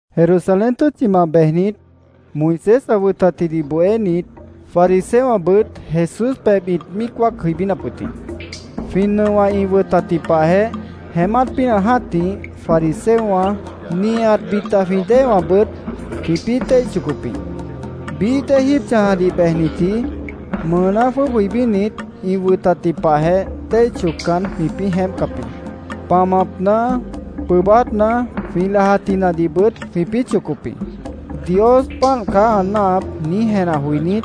Jerusalén tʉ́tchimant bejnit, Moisés ã wʉtatjidih bohénit, fariseowãbʉt Jesús pebh ĩt míic wáac jʉibínap wʉt jĩ. Jwĩ nʉowã ĩ wʉtatji pahjeh, jeémát pínah jã́tih fariseowã, nihat bita jwĩ déewãbʉt jwĩpĩ́ téih chocop jĩ. Bií dée jíib chãjadih bejnitji mʉʉná jwʉ́ʉb jʉibínit, ĩ wʉtatji pahjeh téih choccan, jwĩpĩ́ jeémpcap jĩ. Pamapna, pʉʉbátna, jwĩ lajatjinadihbʉt jwĩpĩ́ chocop jĩ. “Dios páant caá ã náahap”, niíj jenah joinít,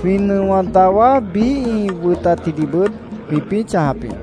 jwĩ nʉowã dawá biíh ĩ wʉtatjidihbʉt jwĩpĩ́ chãjap jĩ.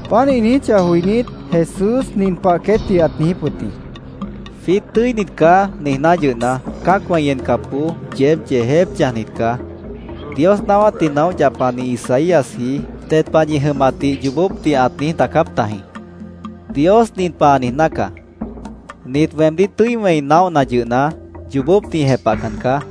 Páant ĩ niijíchah joinít, Jesús nin pah queétdih ãt niijíp wʉt jĩ: —‘Jwiít tʉ́init caá’, niijná yʉhna, cã́acwã ĩ encapboó yeéb yeejép chãjnit caá. Dios naáwátdih naóh yapani Isaíasji ded pah ñi jʉmatdih yoobópdih ãt niíj daacáp tajĩ: ‘Dios nin pah ã niijná caá: “Nit weemdíh tʉ́i wẽi naóhna yʉhna, yoobópdih ĩ jepahcan caá.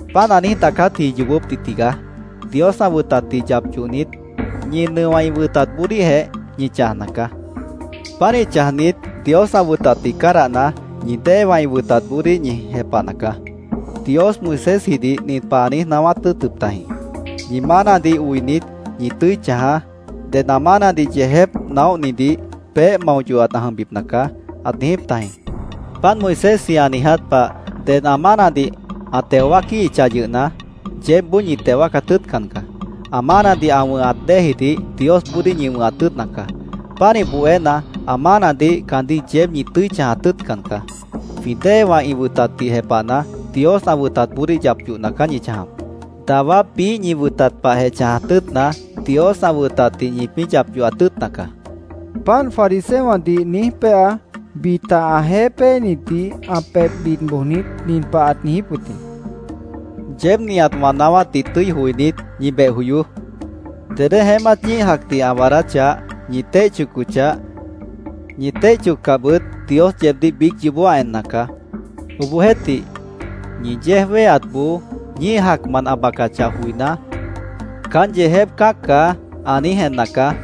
Páant ã niíj daacátji yoobópdih tigaá. Dios ã wʉtatdih yap yohnit, ñi nʉowã ĩ wʉtatboodíhjeh ñi chãjna caá. Pánih chãjnit, Dios ã wʉtatdih cádahna, ñi déewã ĩ wʉtatboodíh ñi jepahna caá. Dios Moisésjidih nin pah ãt niíj naáwát tʉ́ʉtʉp tajĩ: ‘Ñi mánadih oinit, ñi tʉ́i chãjaá. Ded ã mánadih yeejép naóhnidih peéh mao yohat ã jʉmbipna caá’, ãt niijíp tajĩ. Páant Moisésji ã niiját pah, ded ã mánadih ã teo wáaquíhichah yʉhna, yeébboó ñi teo wáacat tʉ́ʉtcan caá. Ã mánadih ã wʉ̃hat déejidih Diosboodíh ñi wʉ̃hat tʉ́ʉtna caá. Pánih bohéna, ã mánadih caandíh yeéb ñi tʉ́i chãjat tʉ́ʉtcan caá. Jwĩ déewã ĩ wʉtatdih jepahna, Dios ã wʉtatboodíh yap yohna caá ñi chãjap. Dawá biíh ñi wʉtat pahjeh chãjat tʉ́ʉtna, Dios ã wʉtatdih ñipĩ́ yap yohat tʉ́ʉtna caá, Jesús ãt niijíp wʉt jĩ. Páant fariseowãdih niíj péa, bita ãjeéh péenitdih ã pebh bid bojnit, nin pah ãt niijíp wʉt jĩ: —Yeéb nihat wã naáwátdih tʉ́i joinít, ñi beh joyoó. Dedé jeémát ñíih jacdih ã waadáchah, ñi téih chocochah, ñi téih choccahbʉt, Dios yeebdíh biíc yoobó ã enna caá. Obohjeéhtih, ñi yéej wéheatboó ñíih jacmant ã bacachah joiná, ‘Caán yeejép cã́ac caá’, ã niíj enna caá.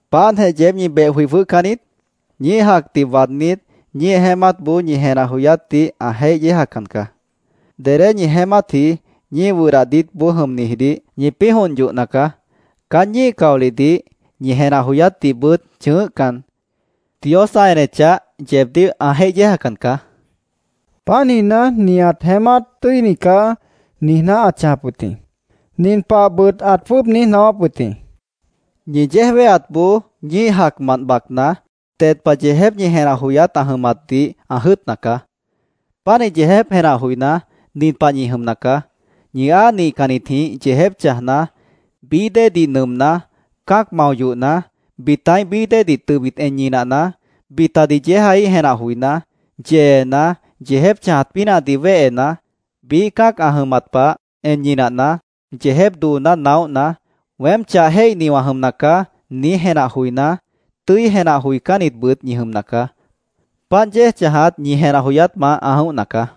—¿Páantjeh yeéb ñi beh joi jwʉ́hcan niít? Ñíih jacdih waadnít, ñíih jeémátboó ñi jenah joyátdih ã jéih yéejacan caá. Dedé ñi jeémátji ñíih wʉdah diítboó jʉmnijidih ñipĩ́ jont yohna caá. Caán ñíih caolihdih, ñi jenah joyátdihbʉt chʉ̃ʉ́hcan, Dios ã enechah, yeebdíh ã jéih yéejacan caá, ãt niijíp wʉt jĩ. Páant niijná, “Nihat jeémát tʉ́ini caá”, niijná ãt chãjap wʉt jĩ. Nin pahbʉt ãt jwʉ́ʉb niíj naáwáp wʉt jĩ: —Ñi yéej wéheatboó ñíih jacmant bacna, ded pah yeejép ñi jenah joyát ã jʉmatdih ã jʉ́ʉtna caá. Pánih yeejép jenah joiná, nin pah ñi jʉmna caá: Ñi áa nihcannitjĩh yeejép chãjna, bií déedih nʉʉmná, cã́ac mao yohna, bitaíh bií déedih tʉbit en ñinahna, bitadih yéejaíh jenah joiná, yeena, yeejép chãjat pínahdih wéhena, biíh cã́ac ã jʉmat pah en ñinahna, yeejép dooná naóhna, ‘Weém chah jéihni wã jʉmna caá’, niíj jenah joiná, tʉ́i jenah joicánnitbʉt ñi jʉmna caá. Páant yéej chãjat ñi jenah joyátmant ã jʉ̃óhna caá.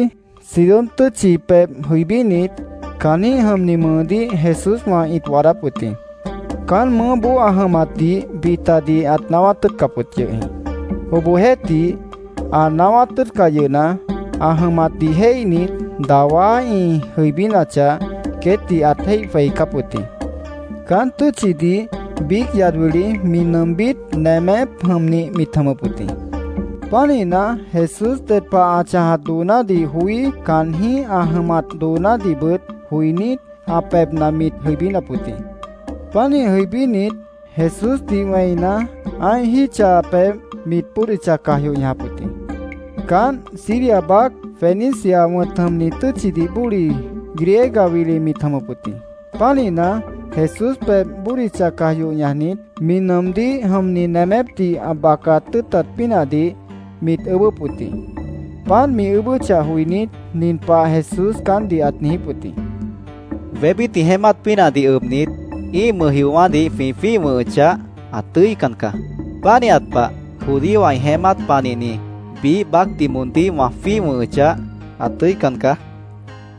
Tiro tʉ́tchi, Sidón tʉ́tchi pebh jʉibínit, caanjĩ́h jʉmni mʉʉdíh Jesúswã ĩt waadáp wʉt jĩ. Caán mʉʉ́boó ã jʉmatdih bitadih ãt naáwát tʉ́ʉtcap wʉt yʉh jĩ. Obohjeéhtih, ã naáwát tʉ́ʉtcah yʉhna, ã jʉmatdih jéihnit, dawá ĩ jʉibínachah, queétdih ãt jéih jweicáp wʉt jĩ. Caán tʉ́tchidih biíc yad wili mi nʉʉmbít nemép jʉmnih mit jʉmʉp wʉt jĩ. Pánihna, Jesús ded pah ã chãjat doonádih joí, caanjĩ́h ã jʉmat doonádihbʉt joinít, ã pebhna mit jʉibínap wʉt jĩ. Pánih jʉibínit, Jesúsdih wẽina, ã́ih jítcha pebh mit bódicha caj yoh ñajap wʉt jĩ. Caánt Siria baác Fenicia wʉ̃t jʉmni tʉ́tchidih bóli, Griega wili mit jʉmʉp wʉt jĩ. Pánihna, Jesús pebh bódicha caj yoh ñajnit, mi nʉʉmdíh jʉmni nemépdih ã bacat tʉ́ʉtat pínahdih mit ʉʉ́bʉ́p wʉt jĩ. Páant mi ʉʉ́bʉ́chah joinít, nin pah Jesús caántdih ãt niijíp wʉt jĩ: —Wébít ĩ jeémát pínahdih ʉbnit, ĩ́ih mʉjjiowã́dih jwĩ jwíih wʉ̃hʉchah, ã tʉ́ican caá. Pánihat pah, judíowã ĩ jeémát panihni biíh baácdih moondíh wã jwíih wʉ̃hʉchah, ã tʉ́ican caá, ãt niijíp wʉt jĩ.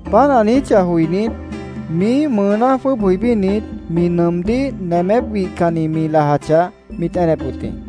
Páant ã niijíchah joinít, miíh mʉʉná jwʉ́ʉb jʉibínit, mi nʉʉmdíh nemép wihcannih mi lajachah, mit enep wʉt jĩ.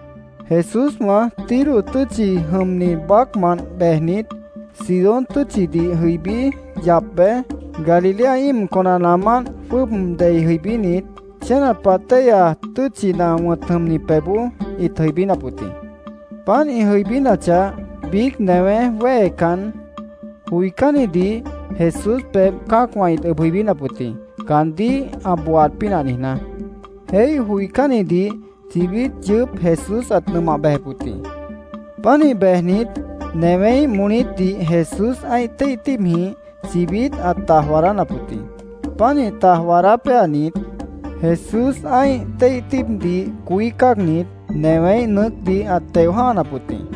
Jesúswã Tiro tʉ́tchi jʉmni baácmant bejnit, Sidón tʉ́tchidih jʉibí yap bej, Galilea íim conanaamánt jwʉ́ʉb dei jʉibínit, Chénat Pah Téihya Tʉ́tchina wʉ̃t jʉmni pebhboó ĩt jʉibínap wʉt jĩ. Páant ĩ jʉibínachah, biíc newé wéhecan, joicánnidih Jesús pebh cã́acwã ĩt ʉb jʉibínap wʉt jĩ, caandíh ã booaat pínah niijná. Jéih joicánnidih chibít yʉʉ́p Jesús ãt nʉmah bejep wʉt jĩ. Pánih bejnit, newéíh molítdih Jesús ã́ih téih tíibjĩh chibít ãt taj waadánap wʉt jĩ. Pánih taj waadá péanit, Jesús ã́ih téih tíibdih coí cáagnit, newéíh nʉʉ́cdih ãt teo jã́hanap wʉt jĩ.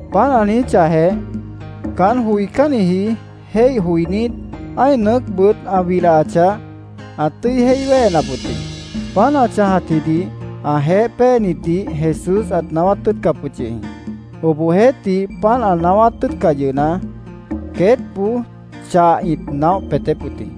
Páant ã niijíchahjeh, caán joicánniji jéih joinít, ã́ih nʉʉ́cbʉt ã wilahachah, ãt tʉ́i jéih wéhenap wʉt jĩ. Páant ã chãjatjidih ãjeéh péenitdih Jesús ãt naáwát tʉ́ʉtcap wʉt yʉh jĩ. Obohjeéhtih, páant ã naáwát tʉ́ʉtcah yʉhna, queétboó chah ĩt naóh peetép wʉt jĩ.